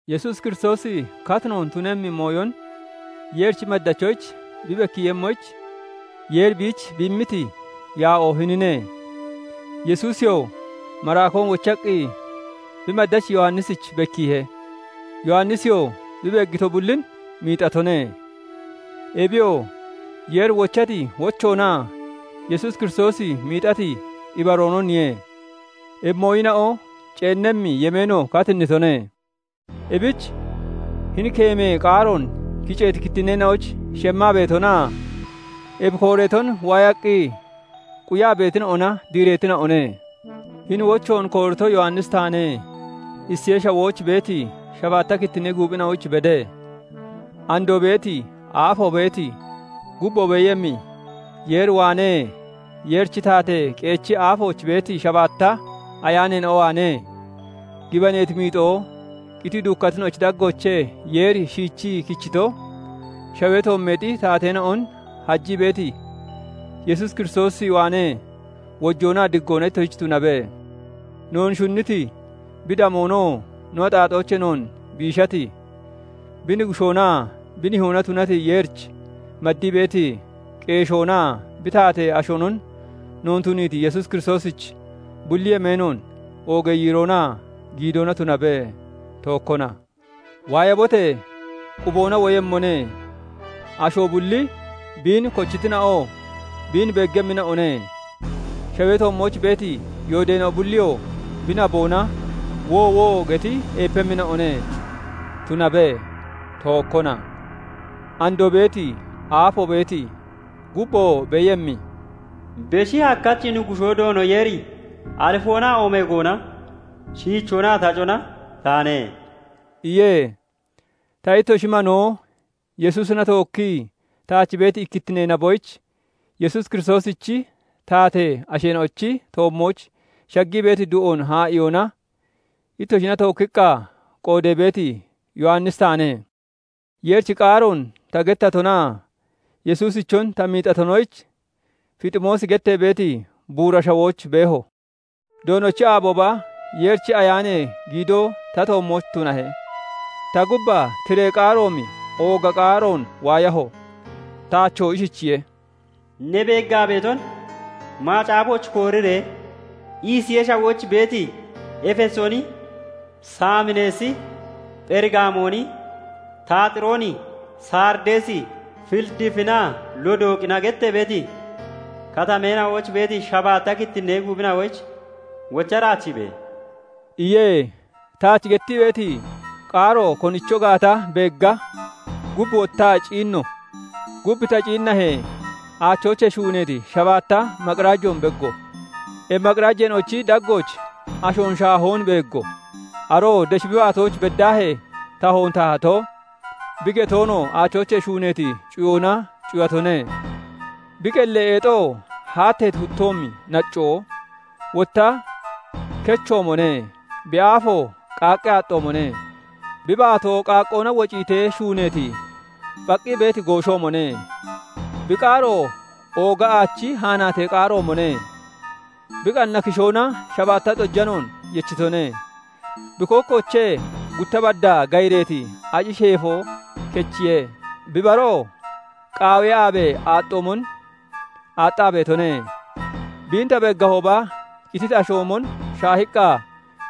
Yesuus Kiristoosi katinoon tunemmi mooyon Yeerichi maddachina'oyich bi bekkiiyemmoyich Yeeri biich bi immiti yaa'oo hinine. Yesuusiyoo maraakoon wochaqqi, bi maddachi Yowannisich bekkiihe. Yowannisiyoo bi beeggito bullin miixatone. Ebiyoo Yeeri wochati wochoonaa Yesuus Kiristoosi miixati ibaroononiye. Ebi mooyina'o ceennemmi yemeeno katinnitone; ebich hini keemee qaaroon kiceeti kittinneena'oyich shemmaa beetonaa ebi kooreeton waayaqqi quyaa beetina'ona diireetina'one. Hini wochoon koorito Yowannisi taane. Isiyee Shawooch beeti shabaatta kittinnee guuphina'oyich bede. Andoo beeti, aafoo beeti, gubboo beeyemmi Yeer waanee, Yeerichi taatee qeechi aafooch beeti shabaatta ayaaneena'o waanee, gibaneeti miixoo, qitii duukkatina'ochi daggoochee Yeeri shiichii kichito, shawee toommeexi taateena'on hajii beeti Yesuus Kiristoosi waanee wojoonaa diggoona ittoshich tunabe. Noon shunniti, bi damoonoo no axaaxoochee noon biishati, bi Nuggushoonaa bi Nihoona tunati Yeerich maddii beeti qeeshoonaa bi taatee ashoonon noon tuniiti Yesuus Kiristoosich bulli yemeenoon oogee yiiroonaa giidoona tunabe; tookkona. Waayabote! Quboona woyemmone. Asho bulli, biin kochitina'oo biin beeggemmina'one; shawee toommooch beeti yoodeena'o bulliyoo bi naboona "Woowo!" geti eepemmina'one. Tunabe; tookkona. Andoo beeti, aafoo beeti, gubboo beeyemmi, Beshi Hakkachi Nuggushoo Doono Yeeri Alifoonaa Oomeegoona, Shiichoonaa Tacona taane" iye. Ta ittoshi manoo, Yesuusina tookkii taach beeti ikkittinee naboyich Yesuus Kiristoosichi taatee asheena'ochi toommooch shaggii beeti du'oon haa'iyoona ittoshina tookkiqqa qoodee beeti Yowannisi taane. Yeerichi qaaroon ta gettatonaa Yesuusichon ta miixatonoyich Fiximoosi gettee beeti buura shawooch beeho. Doonochi aabooba Yeerichi Ayaanee giidoo ta toommooch tunahe. Ta gubbaa tiree qaaroomi ooga qaaroon waayaho; taachoo ishichiye:- "Ne beeggaa beeton macaafooch kooriree Isiyee Shawooch beeti, Efesooni, Saamineesi, Pherigaamooni, Taaxirooni, Sarideesi, Filidiifinaa Lodooqina gettee beeti Katameena'ooch beeti shabaatta kittinnee guuphina'oyich wocha daachiibe!" iye. Taach gettii beeti qaaro konicho gaata beegga, gub wottaa ciinno; gub ta ciinnahee, aachoochee shuuneeti shabaatta maqirajoon beeggo. Ebi maqirajeena'ochi daggooch ashoon shaahoon beeggo; aroo desh bi baatooch beddaahee tahoon tahato, bi getoonoo aachoochee shuuneeti cuyoona cuyatone. Bi qellee eexoo haatteeti huttoomi naccoo, wotta kechoomone; bi aafoo qaqqee aaxxoomone; bi baatoo qaaqqoona wociitee shuuneeti, phaqqii beeti gooshoomone; bi qaaroo ooga aachi haanaatee qaaroomone. Bi qanna kishoona shabaatta xojanoon yechitone; bi kookkoochee gutta baddaa gayireeti aci sheefo kechiye; bi baroo qaawee aabee aaxxoomon aaxxaa beetone. Biin ta beeggahooba, qititi ashoomon shaahiqqa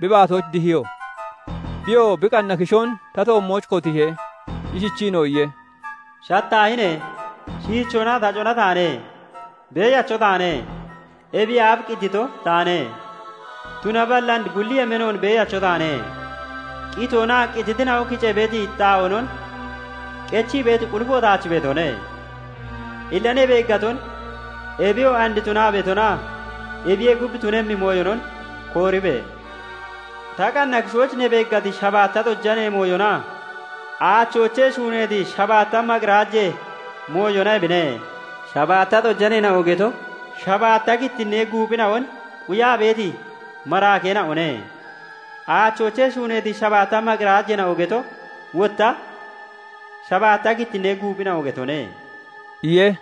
bi baatooch dihiyo. Biyoo bi qanna kishoon ta toommooch kotiihe; ishichiinoo iye:- "Shataahine! Shiichoonaa Tacona taane; Beeyacho taane; ebiyee aaf qitito taane; tunaballi and bulli yemeenoon Beeyacho taane; qitoonaa qititina'o kicee beeti xaa'oonon qechii beeti qulifo taach beetone. Illa ne beeggaton, ebiyoo and tunaa beetonaa ebiyee gub, tunemmi mooyonon kooribe! Ta qanna kishooch ne beeggati shabaatta xojanee mooyonaa aachoochee shuuneeti shabaatta maqirajee mooyona ebine; shabaatta xojaneena'o geto, shabaatta kittinnee guuphina'on quyaa beeti maraakeena'one; aachoochee shuuneeti shabaatta maqirajeena'o geto wotta, shabaatta kittinnee guuphina'o getone" iye.